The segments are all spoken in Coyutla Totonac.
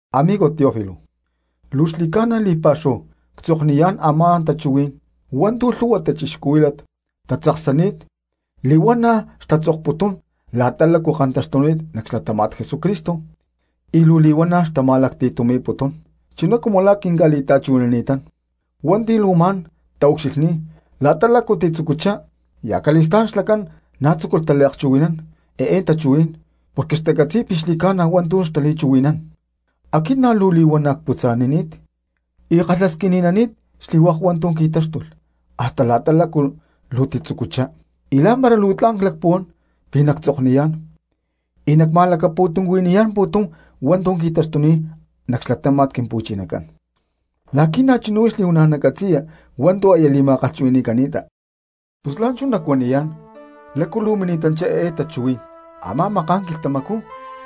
Amigo Teófilo: Luu xli̠ca̠na li̠pa̠xúhu ctzokniyá̠n a̠má tachuhuí̠n hua̠ntu̠ lhu̠hua cristianos tatzaksani̠t li̠huana̠ xtatzokputún la̠ta túcu kantáxtulh nac xlatáma̠t Jesucristo y luu li̠huana̠ xtama̠lacti̠tumi̠putún, chuná cumu la̠ quinca̠li̠ta̠chuhui̠nani̠tán hua̠nti̠ luu ma̠n taucxilhní̠t la̠ta lácu titzucuchá, y acali̠stá̠n xlacán na̠ tzúculh taliakchuhui̠nán eé tachuhuí̠n porque xtacatzi̠y pi̠ xli̠cána hua̠ntu̠ xtali̠chuhui̠nán. Aquit na̠ luu li̠huana̠ cputza̠nani̠t y ckalhasquini̠nani̠t xli̠hua̠k hua̠ntu̠ qui̠táxtulh hasta la̠ta lácu luu titzucuchá, y lá̠mpara luu tla̠n clacpuhuán pi̠ nactzokniyá̠n y nacma̠lacti̠tumi̠niyá̠n pu̠tum hua̠ntu̠ qui̠taxtuni̠t nac xlatáma̠t Quimpu̠chinacán, la̠qui̠ na̠chuná huix nacatzi̠ya li̠huana̠ hua̠ntu̠ aya li̠ma̠kalhchuhui̠ni̠cani̠ta. Pus la̠nchú nacuaniyá̠n lácu luu mini̠tanchá eé tachuhuí̠n: Amá maká̠n quilhtamacú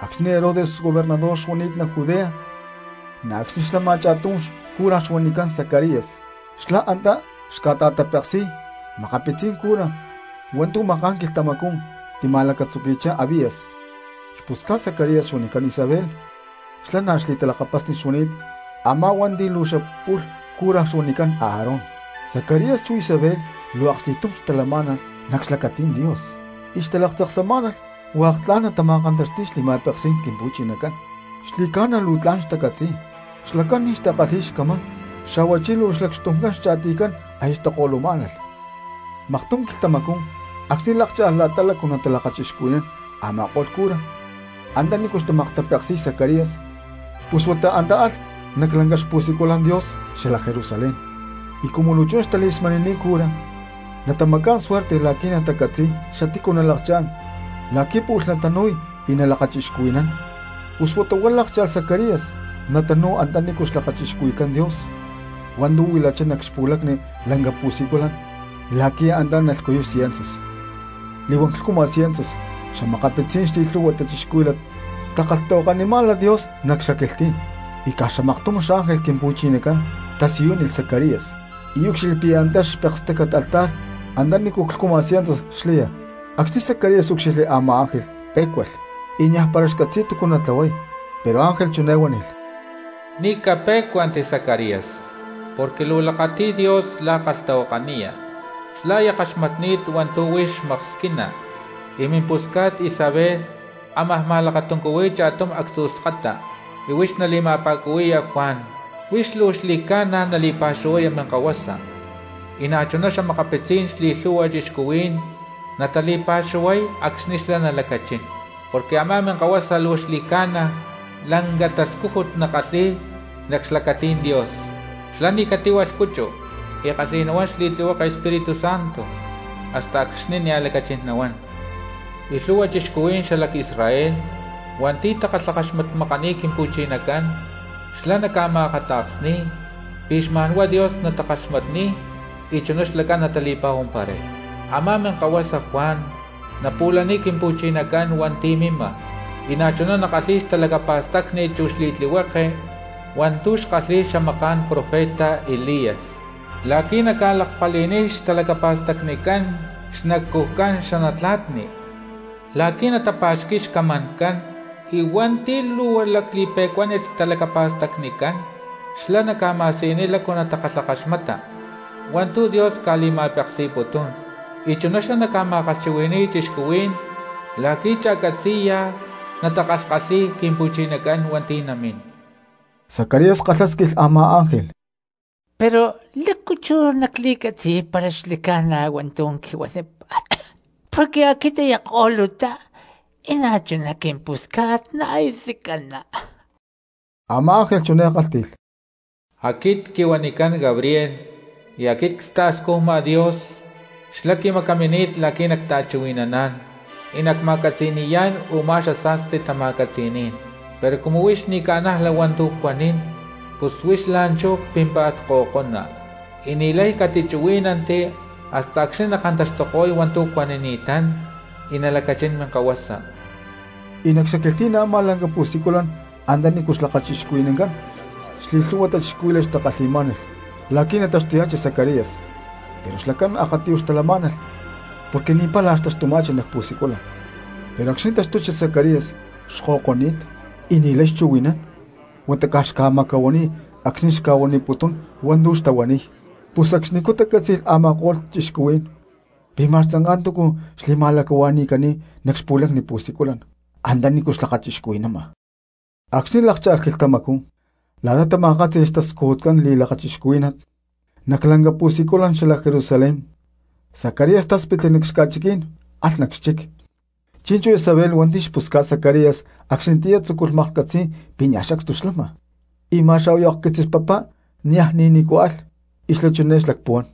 acxni̠ Herodes gobernador xuani̠t nac Judea, na̠ acxni̠ xlama cha̠tum cura xuanicán Zacarías xlá antá xca̠ta̠tapeksi̠y makapitzí̠n cura hua̠ntu̠ maká̠n quilhtamaxcú tima̠lacatzuqui̠chá Abías. Xpusca̠t Zacarías xuanicán Isabel, xlá na̠ xli̠talakapasni xuani̠t a̠má hua̠nti̠ luu xapu̠lh cura xuanicán Aarón. Zacarías chu Isabel luu aksti̠tum xtalamá̠nalh nac xlacatí̠n Dios y xtalaktzaksamá̠nalh hua̠k tla̠n natama̠kantaxti̠y xli̠ma̠peksí̠n Quimpu̠chinacán, xli̠ca̠na luu tla̠n xtacatzi̠y. Xlacán ni̠ xtakalhi̠y xcamán, xa̠huachí luu xlacxtumcán xcha̠tiycán aya xtako̠lumá̠nalh. Maktum quilhtamacú acxni̠ lákcha̠lh la̠ta lácu natalakachixcuhui̠nán a̠ma̠ko̠lh cura antanícu xmaktapeksi̠y Zacarías, pus huata antá alh nac lanca xpusiculan Dios xalac Jerusalén. Y cumu luu chuná xtali̠smani̠ni̠t cura natamacá̠n suerte la̠qui̠ natacatzi̠y xatícu nalakchá̠n la̠qui̠ pu̠lh natanu̠y y nalakachixcuhui̠nán, pus huata huá lákcha̠lh Zacarías natanu̠y antanícu xlakachixcuhui̠cán Dios hua̠ntu̠ huilachá nac xpu̠lacni lanca pu̠siculan la̠qui̠ antá nalhcuyuy ciensus. Li̠huán clhcuma ciensus xa̠makapitzí̠n xli̠lhu̠hua cristianos xtakalhtahuakanimá̠nalh Dios nac xaquilhtí̠n. Y caj xamaktum xángel Quimpu̠chinacán tasiyúnilh Zacarías y úcxilhli pi̠ antá nac xpekstácat xlaya altar antanícu clhcuma ciensus. Acxni̠ Zacarías úcxilhli a̠má ángel pé̠cualh y niaj para xcatzi̠y túcu natlahuay. Pero ángel chiné huánilh: —Ni̠ capé̠cuanti Zacarías, porque luu lakati̠y Dios la̠ kalhtahuakaniya, xlá aya kaxmatni̠t hua̠ntu̠ huix maksquina y mimpusca̠t Isabel ámaj ma̠lakatuncuhui̠y cha̠tum actzu̠ skata y huix nali̠ma̠pa̠cuhui̠ya Juan. Huix luu xli̠ca̠na nali̠pa̠xuhuaya minkahuasa y na̠chuná xa̠makapitzí̠n xli̠lhu̠hua cristianos natali̠pa̠xuhuay acxni̠ xlá nalacachín, porque a̠má minkahuasa luu xli̠ca̠na lanca tascújut nakalhi̠y nac xlacatí̠n Dios. Xlá ni̠ catíhualh cuchu, y kalhi̠y nahuán xli̠tlihueke Espíritu Santo hasta acxni̠ nia̠ lacachín nahuán. Y lhu̠hua cristianos xalac Israel hua̠nti̠ takalhakaxmatmakani̠t Quimpu̠chinacán xlá naca̠ma̠akata̠ksni̠y pi̠ xma̠n huá Dios nakaxmatko̠y y chuná xlacán natali̠pa̠huamparay. Amá minkahuasa Juan napu̠laniy Quimpu̠chinacán hua̠nti̠ mima, y na̠chuná nakalhíy xtalacapa̠stacni chú xli̠tlihueke hua̠ntu̠ xkalhi̠y xamaká̠n profeta Elías la̠qui̠ naca̠lakpali̠niy xtalacapa̠stacnicán xnacujcán xanatla̠tni la̠qui̠ natapa̠xqui̠y xcamancán, y hua̠nti̠ luu lacli̠pe̠cuánit xtalacapa̠stacnicán xlá naca̠ma̠siyuniy lácu natakalhakaxmatni̠nán hua̠ntu̠ Dios ca̠li̠ma̠peksi̠putún. Y chuná xlá naca̠ma̠kalhchuhui̠ni̠y cristianos la̠qui̠ cha̠catzi̠ya natakalhkalhi̠y Quimpu̠chinacán hua̠nti̠ namín. Zacarías kalhásquilh a̠má ángel: —¿Pero lácu chú nacli̠catzi̠y para xli̠ca̠na hua̠ntu̠ quihuanípa̠t? Porque aquit aya ko̠lutá y na̠chuná quimpusca̠t na̠ aya tzicaná. Amá ángel chiné kálhti̠lh: —Aquit quihuanicán Gabriel, y aquit cta̠scujma Dios, xlá quimacamini̠t la̠qui̠ nacta̠chuhui̠naná̠n y nacma̠catzi̠ni̠yá̠n u̠má xasa̠sti tama̠catzi̠ní̠n. Pero cumu huix ni̠ ca̠najla hua̠ntu̠ cuanín pus huix la̠nchú pímpa̠t ko̠ko̠na, y ni̠lay catichuhuí̠nanti hasta acxni̠ nakantaxtuko̠y hua̠ntu̠ cuanini̠tán y nalacachín minkahuasa. Y nac xaquilhtí̠n a̠má lanca pu̠siculan antanícu xlakachixcuhui̠nancán, xli̠lhu̠hua cristianos xtakalhi̠má̠nalh la̠qui̠ nataxtuya̠chi Zacarías, pero xlacán akatiyuj xtalamá̠nalh porque ni̠ pála xtaxtuma̠chi nac pu̠siculan. Pero acxni̠ taxtuchi Zacarías xko̠ko̠ni̠t y ni̠lay xchuhui̠nán huata caj xca̠macahuaniy acxni̠ xca̠kalhti̠putún hua̠ntu̠ xtahuaniy; pus acxnicú tacátzi̠lh a̠ma̠ko̠lh cristianos pi̠ ma̠x tzanká túcu xli̠ma̠lacahua̠ni̠cani̠t nac xpu̠lacni pu̠siculan antanícu xlakachixcuhui̠nama. Acxni̠ lákcha̠lh quilhtamacú la̠ta tama̠kátzi̠lh xtascujutcán li̠lakachixcuhuí̠nat nac lanca pu̠siculan xalac Jerusalén Zacarías táspitli nac xca̠chiquí̠n nac xchic. Chi̠nchú Isabel hua̠nti̠ xpusca̠t Zacarías acxnitiyá tzúculh maklhcatzi̠y pi̠ niaj sacstu xlama, y ma̠x a̠huayu akquitzis papá niaj ni̠ nícu alh; y xlá chiné xlacpuhuán: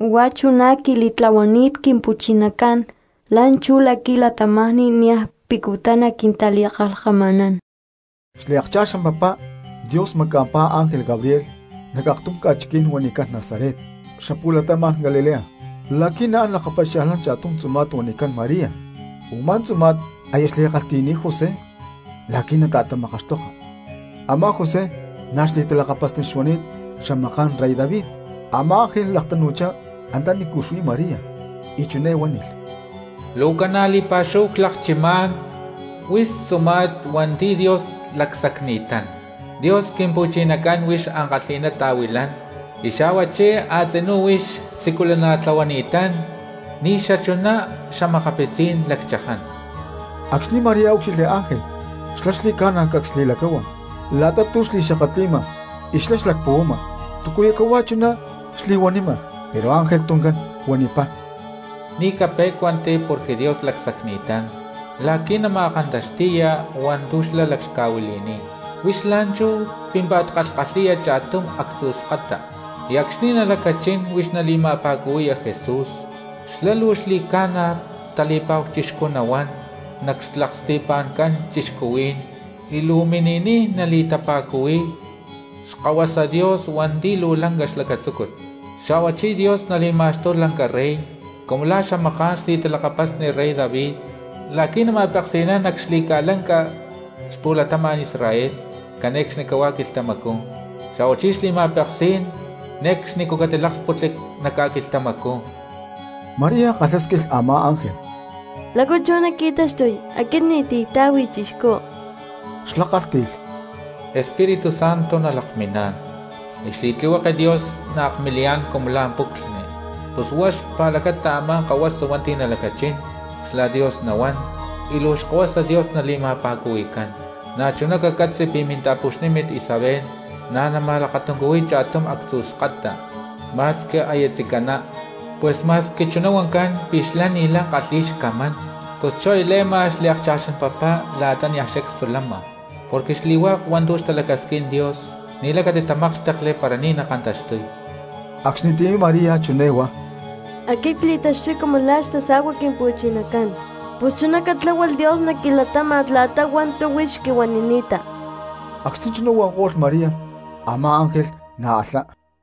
“Huá chuná quili̠tlahuani̠t Quimpu̠chinacán la̠nchú la̠qui̠ cristianos niaj pucutá naquintali̠kalhkama̠nán.” Xliakcha̠xán papá Dios maca̠mpá ángel Gabriel nac aktum ca̠chiquí̠n xuanicán Nazaret cxapu̠latama̠n Galilea la̠qui̠ naán lakapaxia̠lhnán cha̠tum tzuma̠t xuanicán María, u̠má tzuma̠t aya xli̠kalhti̠ni̠t José la̠qui̠ nata̠tamakaxtoka; a̠má José na̠ xli̠talakapasni xuani̠t xamaká̠n rey David. Amá ángel laktanu̠chá antanícu xuí María y chiné huánilh: —¡Luu ca̠na li̠pa̠xúhu clakchimá̠n huix tzuma̠t hua̠nti̠ Dios lacsacni̠tán! Dios Quimpu̠chinacán huix ankalhi̠ná ta̠huilán, y xa̠huachí a̠tzinú huix siculana̠tlahuani̠tán ni̠ xachuná xa̠makapitzí̠n lacchaján. Acxni̠ María úcxilhli ángel xlá xli̠ca̠na cacs li̠lacáhua la̠ta tu̠ xli̠xakatli̠ma, y xlá xlacpuhuama túcu cahuá chuná xli̠huanima. Pero ángel tuncán huanipá: —María, ni̠ capé̠cuanti porque Dios lacsacni̠tán la̠qui̠ nama̠kantaxti̠ya hua̠ntu̠ xlá laclhca̠huili̠ni̠t. Huix la̠nchú pímpa̠t kalhkalhi̠ya cha̠tum actzu̠ skata, y acxni̠ nalacachín huix nali̠ma̠pa̠cuhui̠ya Jesús. Xlá luu xli̠ca̠na tali̠pa̠hu chixcú nahuán nac xlaksti̠pa̠ncán cristianos y luu namini̠niy nali̠tapa̠cuhui̠y Xkahuasa Dios hua̠nti̠ luu lanca xlacatzúcut. Xa̠huachí Dios nali̠ma̠xtuy lanca rey cumu la̠ xamaká̠n xli̠talakapasni rey David, la̠qui̠ nama̠peksi̠nán nac xli̠ca̠lanca xpu̠latama̠n Israel cane̠cxnicahuá quilhtamacú, xa̠huachí xli̠ma̠peksí̠n ne̠cxni catiláksputli nac ca̠quilhtamacú. María kalhásquilh a̠má ángel: —¿Pero lácu chú luu naqui̠taxtuy porque aquit ni̠ti̠ cta̠hui chixcú? Xlá kálhti̠lh: —Espíritu Santo nalakminá̠n y xli̠tlihueke Dios naakmiliyá̠n cumu lá puclhni, pus huá xpa̠lacata a̠má kahuasa hua̠nti̠ nalacachín xla Dios nahuán y luu Xkahuasa Dios nali̠ma̠pa̠cuhui̠cán. Na̠chuná cacatzi pi̠ minta̠puxnímit Isabel na̠ nama̠lakatuncuhuiy cha̠tum actzu̠ skata ma̠squi aya tzicaná. Pus ma̠squi chuná huancán pi̠ xlá ni̠lay kalhi̠y xcamán pus chú aya le̠ma xliakcha̠xán papá la̠ta niaj sacstu lama. Porque xli̠hua̠k hua̠ntu̠ xtalacasquín Dios ni̠lay catitamákxtekli para ni̠ nakantaxtuy. Acxnitiyá María chiné huá: —Aquit cli̠taxtuy cumu la̠ xtasa̠cua Quimpu̠chinacán, pus chuná catláhualh Dios nac quilatáma̠t la̠ta hua̠ntu̠ huix quihuanini̠ta. Acxni̠ chuná huanko̠lh María, a̠má ángel na̠ alhá.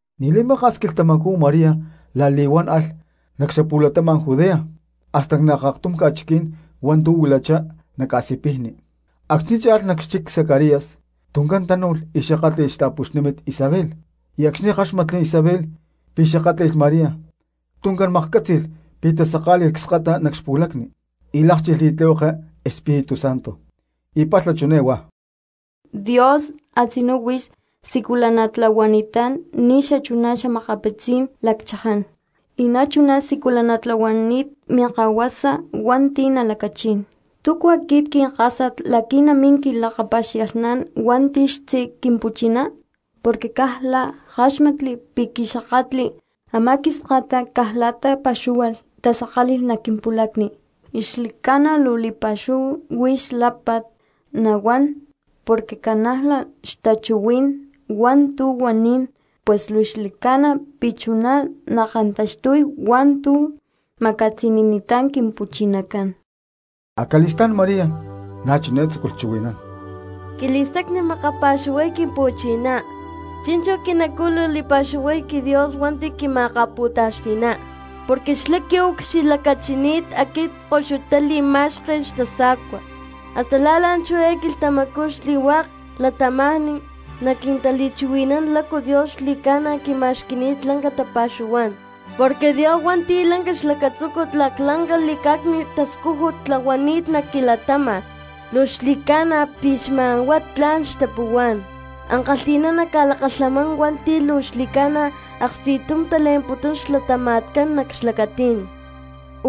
Ni̠ li̠maka̠s quilhtamacú María la̠li̠huán alh nac xapu̠latama̠n Judea hasta nac aktum ca̠chiquí̠n hua̠ntu̠ xuilachá nac ca̠sipijni. Acxni̠ cha̠lh nac xchic Zacarías tuncán tánu̠lh y xakátli̠lh xta̠puxnímit Isabel, y acxni̠ káxmatli Isabel pi̠ xakátli̠lh María tuncán maklhcátzi̠lh pi̠ tasaká̠li̠lh cskata nac xpulacni y lákchilh xli̠tlihueke Espíritu Santo. Y palha chiné huá: —¡Dios a̠tzinú huix siculana̠tlahuani̠tán ni̠ xachuná xa̠makapitzí̠n lacchaján, y na̠chuná siculana̠tlahuani̠t minkahuasa hua̠nti̠ nalacachín! ¿Túcu aquit quinkásat la̠qui̠ namín quilakapaxia̠lhnán hua̠nti̠ xtzí Quimpu̠chiná? Porque caj la̠ ckáxmatli pi̠ quixakatli, a̠má quiskata caj la̠ta pa̠xúhualh tasaká̠li̠lh nac quimpu̠lacni. Xli̠ca̠na luu li̠pa̠xúhu huix lápa̠t nahuán porque ca̠najla xtachuhuí̠n hua̠ntu̠ huanín; pus luu xli̠ca̠na pi̠ chuná nakantaxtuy hua̠ntu̠ ma̠catzi̠ni̠ni̠tán Quimpu̠chinacán. Acali̠stá̠n María na̠ chiné tzúculh chuhui̠nán: Quili̠stacni makapa̠xuhuay Quimpu̠chiná; chi̠nchú quinacú luu li̠pa̠xuhuay quiDios hua̠nti̠ quima̠akapu̠taxti̠ná. Porque xlá quiucxilhlacachini̠t aquit koxuta li̠ma̠xken xtasa̠cua, hasta la̠ la̠nchú eé quilhtamacú xli̠hua̠k cristianos naquintali̠chuhui̠nán lácu Dios xli̠ca̠na quima̠xqui̠ni̠t lanca tapa̠xuhuá̠n. Porque Dios hua̠nti̠ lanca xlacatzúcut laclanca li̠cá̠cni̠t tascújut tlahuani̠t nac quilatáma̠t. ¡Luu xli̠ca̠na pi̠ xma̠n huá tla̠n catzi̠y xtapuhuá̠n! Ankalhi̠ná naca̠lakalhamán hua̠nti̠ luu xli̠ca̠na aksti̠tum tale̠mputún xlatama̠tcán nac xlacatí̠n.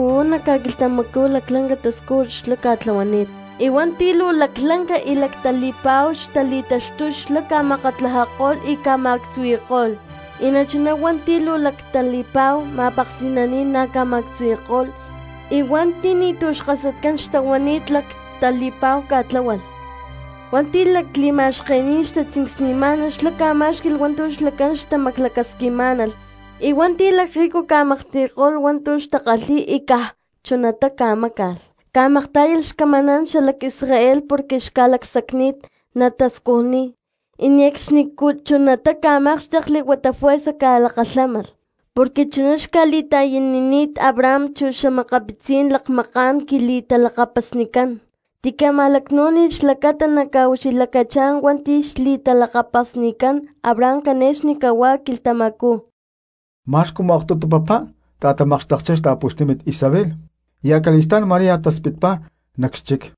Uú nac ca̠quilhtamacú laclanca tascújut xlá ca̠tlahuani̠t, y hua̠nti̠ luu laclanca y lactali̠pa̠hu xtali̠taxtuy xlá ca̠makatlajako̠lh y ca̠ma̠actzuhui̠ko̠lh. Y na̠chuná hua̠nti̠ luu lactali̠pa̠hu ma̠peksi̠naní̠n na̠ ca̠ma̠actzuhui̠ko̠lh, y huata hua̠nti̠ ni̠tu̠ xkasatcán xtahuani̠t lactali̠pa̠hu ca̠tláhualh. Hua̠nti̠ lakli̠ma̠xkení̠n xtatzincsni̠má̠nalh xlá ca̠má̠xqui̠lh hua̠ntu̠ xlacán xtamaclacasquimá̠nalh, y hua̠nti̠ lacrrico ca̠maklhti̠ko̠lh hua̠ntu̠ xtakalhi̠y y caj chunatá ca̠máca̠lh. Ca̠maktá̠yalh xcamaná̠n xalac Israel porque xca̠lacsacni̠t natascujniy, y ne̠cxni chunatá ca̠mákxtekli huata juerza ca̠lakalhámalh. Porque chuná xca̠li̠ta̠yanini̠t Abraham chu xa̠makapitzí̠n lakmaká̠n quili̠talakapasnicán, tica̠ma̠lacnú̠nilh xlacata naca̠ucxilhlacachá̠n hua̠nti̠ xli̠talakapasnicán Abraham cane̠cxni cahuá quilhtamacú. Ma̠x cumu aktutu papá ta̠tamakxtekchá xta̠puxnímit Isabel y acali̠stá̠n María taspitpá nac xchic.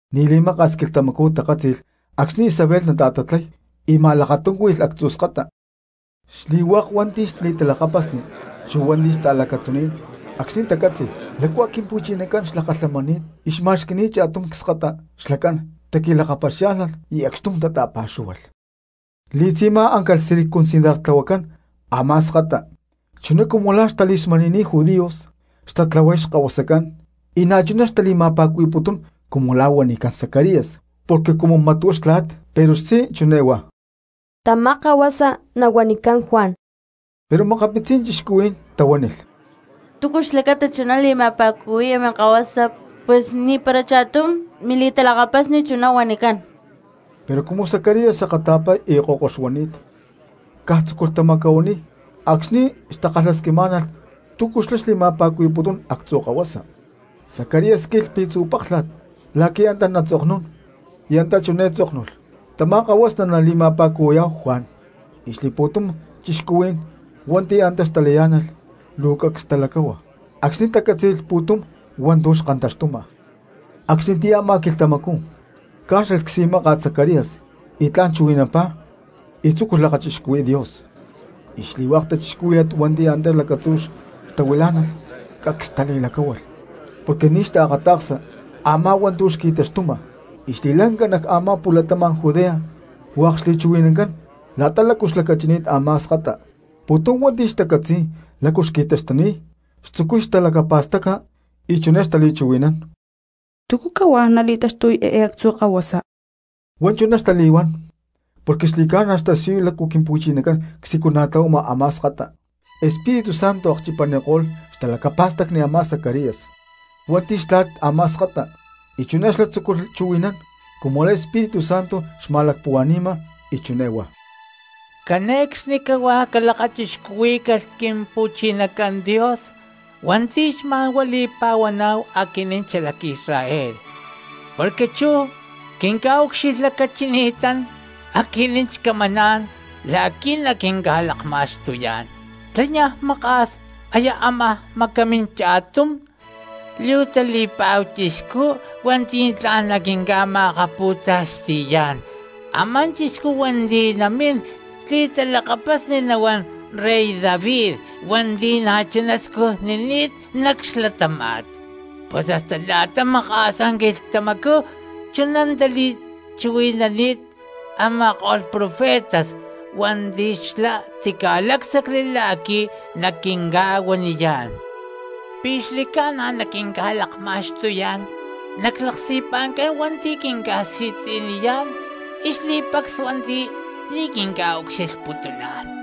Ni̠ li̠maka̠s quilhtamacú takátzi̠lh acxni̠ Isabel nata̠tatlay y ma̠lakatuncúhuilh actzu̠ skata. Xli̠hua̠k hua̠nti̠ xli̠talakapasni chu hua̠nti̠ xta̠lacatzuní̠n acxni̠ tacátzi̠lh lácua Quimpu̠chinacán xlakalhamani̠t y xma̠xqui̠ni̠t cha̠tum cskata xlacán taqui̠lakapaxiá̠lhnalh y acxtum tata̠pa̠xúhualh. Li̠tzi̠má áncalh circuncidartlahuacán ámá skata chuná cumu lá xtali̠smani̠ni̠t judíos xtatlahuay xlakahuasán, y na̠chuná xtali̠ma̠pa̠cuhui̠putún cumu la̠ huanicán Zacarías porque cumu mat huá xtla̠t. Pero xtzí chiné huá: —Tamá kahuasa nahuanicán Juan. Pero makapitzí̠n cristianos tahuánilh: —¿Túcu xlacata chuná nali̠ma̠pa̠cuhui̠ya minkahuasa, pus ni̠para cha̠tum mili̠talakapasni chuná huanicán? Pero cumu Zacarías akata̠pa y ko̠ko xuani̠t caj tzúculh tamacahuaniy acxni̠ xtakalhasquimá̠nalh túcu xlá xli̠ma̠pa̠cuhui̠putún actzu̠ kahuasa. Zacarías squilh pi̠tzu̠ páklha̠t la̠qui̠ antá natzoknún, y antá chiné tzóknulh: “Tamá kahuasa nalitapa̠cuhui̠y Juan.” Y xli̠pu̠tum cristianos hua̠nti̠ antá xtalayá̠nalh luu cacs talacáhua acxni̠ tacátzi̠lh pu̠tum hua̠ntu̠ xkantaxtuma. Acxnitiyá a̠má quilhtamacú cá̠xlalh csi̠máka̠t Zacarías y tla̠n chuhui̠nampá y tzúculh lakachixcuhui̠y Dios. Xli̠hua̠k cristianos hua̠nti̠ antá lacatzú xtahuilá̠nalh cacs xtali̠lacahuán porque ni̠ xtaakata̠ksa a̠má hua̠ntu̠ xqui̠taxtuma, y xli̠ca̠lanca nac a̠má xpu̠latama̠n Judea hua̠k xli̠chuhui̠nancán la̠ta lácu xlacachini̠t a̠má skata. Pu̠tum hua̠nti̠ xtacatzi̠y lácu qui̠taxtuni̠t xtzucuy talacapa̠staca y chiné xtali̠chuhui̠nán: —¿Túcu cahuá nali̠taxtuy eé actzu̠ kahuasa? Huá chuná xtali̠huán porque xli̠ca̠na xtasiyuy lácu Quimpu̠chinacán csiculana̠tlahuama a̠má skata. Espíritu Santo akchipaniko̠lh xtalacapa̠stacni Zacarías hua̠nti̠ xtla̠t a̠má skata y chuná xlá tzúculh chuhui̠nán cumu lá Espíritu Santo xma̠lacpuhua̠ni̠ma, y chiné huá: Cane̠cxnicahuá calakachixcuhuí̠calh Quimpu̠chinacán Dios hua̠nti̠ xma̠nhuá li̠pa̠huaná̠hu aquinín xalac Israel, porque chú xlá quinca̠ucxilhlacachini̠tán aquinín xcamaná̠n la̠qui̠ naquinca̠lakma̠xtuyá̠n. Xlá niaj maka̠s aya amajá macamín cha̠tum luu tali̠pa̠hu chixcú hua̠nti̠ tla̠n naquinca̠ma̠kapu̠taxti̠yá̠n, a̠má chixcú hua̠nti̠ namín xli̠talakapasni nahuán rey David hua̠nti̠ na̠chuná scujnini̠t nac xlatáma̠t. Pus hasta la̠ta maka̠sá quilhtamacú chuná tali̠chuhui̠nani̠t a̠ma̠ko̠lh profetas hua̠nti̠ xlá tica̠lácsacli la̠qui̠ naquinca̠huaniyá̠n, pi̠ xli̠ca̠na naquinca̠lakma̠xtuyá̠n nac xlaksti̠pa̠ncán hua̠nti̠ quinca̠si̠tzi̠niyá̠n, y xli̠pacs hua̠nti̠ ni̠ quinca̠ucxilhputuná̠n.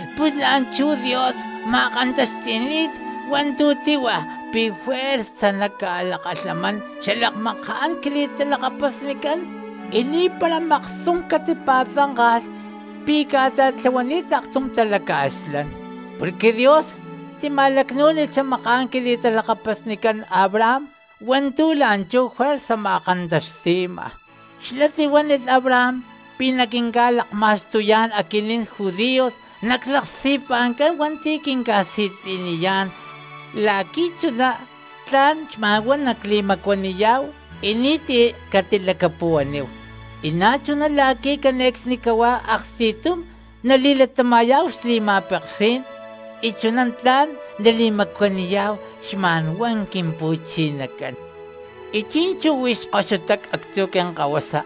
Pus la̠nchú Dios ma̠kantaxti̠ni̠t hua̠ntu̠ tíhua pi̠ juerza naca̠lakalhamán xalakmaká̠n quili̠talakapasnicán, y ni̠para maktum catipa̠tzánka̠lh pi̠ ca̠ta̠tlahuani̠t aktum talaca̠xlán. Porque Dios tima̠lacnú̠nilh xamaká̠n quili̠talakapasnicán Abraham hua̠ntu̠ la̠nchú juerza ma̠kantaxti̠ma. Xlá tihuánilh Abraham pi̠ naquinca̠lakma̠xtuyá̠n aquinín judíos nac xlaksti̠pa̠ncán hua̠nti̠ quinca̠si̠tzi̠niyá̠n, la̠qui̠ chuná tla̠n xma̠n huá nacli̠macuaniyá̠hu y ni̠ti̠ catilacapuhuaníhu, y na̠chuná la̠qui̠ cane̠cxnicahuá aksti̠tum nali̠latama̠yá̠hu xli̠ma̠peksí̠n, y chuná tla̠n nali̠macuaniyá̠hu xma̠nhuá Quimpu̠chinacán. Chi̠nchú huix koxutá actzu̠ quinkahuasa,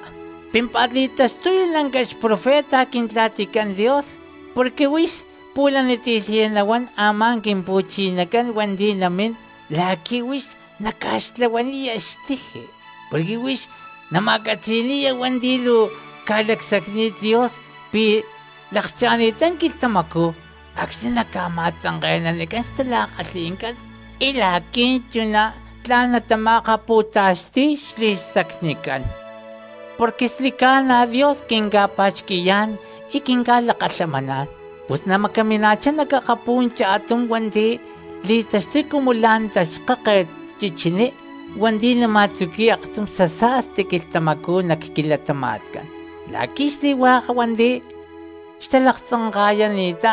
pímpa̠t li̠taxtuya lanca xprofeta Quintla̠ticán Dios, porque huix pu̠laniti̠lhaya nahuán a̠má Quimpu̠chinacán hua̠nti̠ namín la̠qui̠ huix naca̠xtlahuaniya xtiji. Porque huix naca̠ma̠catzi̠ni̠ya hua̠nti̠ luu ca̠lacsacni̠t Dios pi̠ lakcha̠ni̠ttá quilhtamacú acxni̠ naca̠ma̠tzanke̠nanicán xtala̠kalhi̠ncán y la̠qui̠ chuná tla̠n natama̠akapu̠taxti̠y xli̠stacnicán. Porque xli̠ca̠na Dios quinca̠pa̠xqui̠yá̠n y quinca̠lakalhamaná̠n, pus namacamina̠chá nac akapú̠n cha̠tum hua̠nti̠ li̠taxtuy cumu la̠ xtaxkáket chichiní hua̠nti̠ nama̠tzuqui̠y aktum xasa̠sti quilhtamacú nac quilatama̠tcán. La̠qui̠ xli̠hua̠k hua̠nti̠ xtalaktzanka̠ta̠yani̠ttá,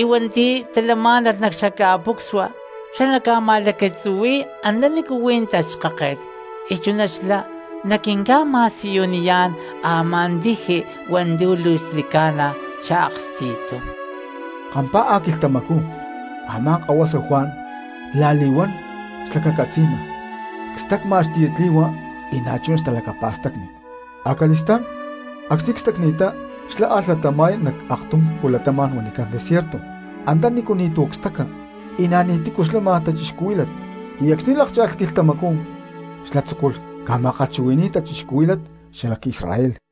y hua̠nti̠ talamá̠nalh nac xaca̠pucsua, xlá naca̠ma̠lacatzuhui̠y antanícu huí taxkáket, y chuná xlá naquinca̠ma̠siyuniyá̠n a̠má tiji hua̠ntu̠ luu xli̠ca̠na xaaksti̠tum. Kampá̠a quilhtamacú y a̠má kahuasa Juan la̠li̠huán xlacacatzi̠ma, cstacma xtiyatli̠hua y na̠chuná xtalacapa̠stacni. Acali̠stá̠n acxni̠ cstacni̠ttá xlá alh latama̠y nac aktum pu̠latama̠n huanicán desierto antanícu ni̠tu̠ staca y na̠ ni̠ti̠cu lama cristianos, y acxni̠ lákcha̠lh quilhtamacú xlá tzúculh ca̠ma̠kalhchuhui̠ni̠y cristianos xalac Israel.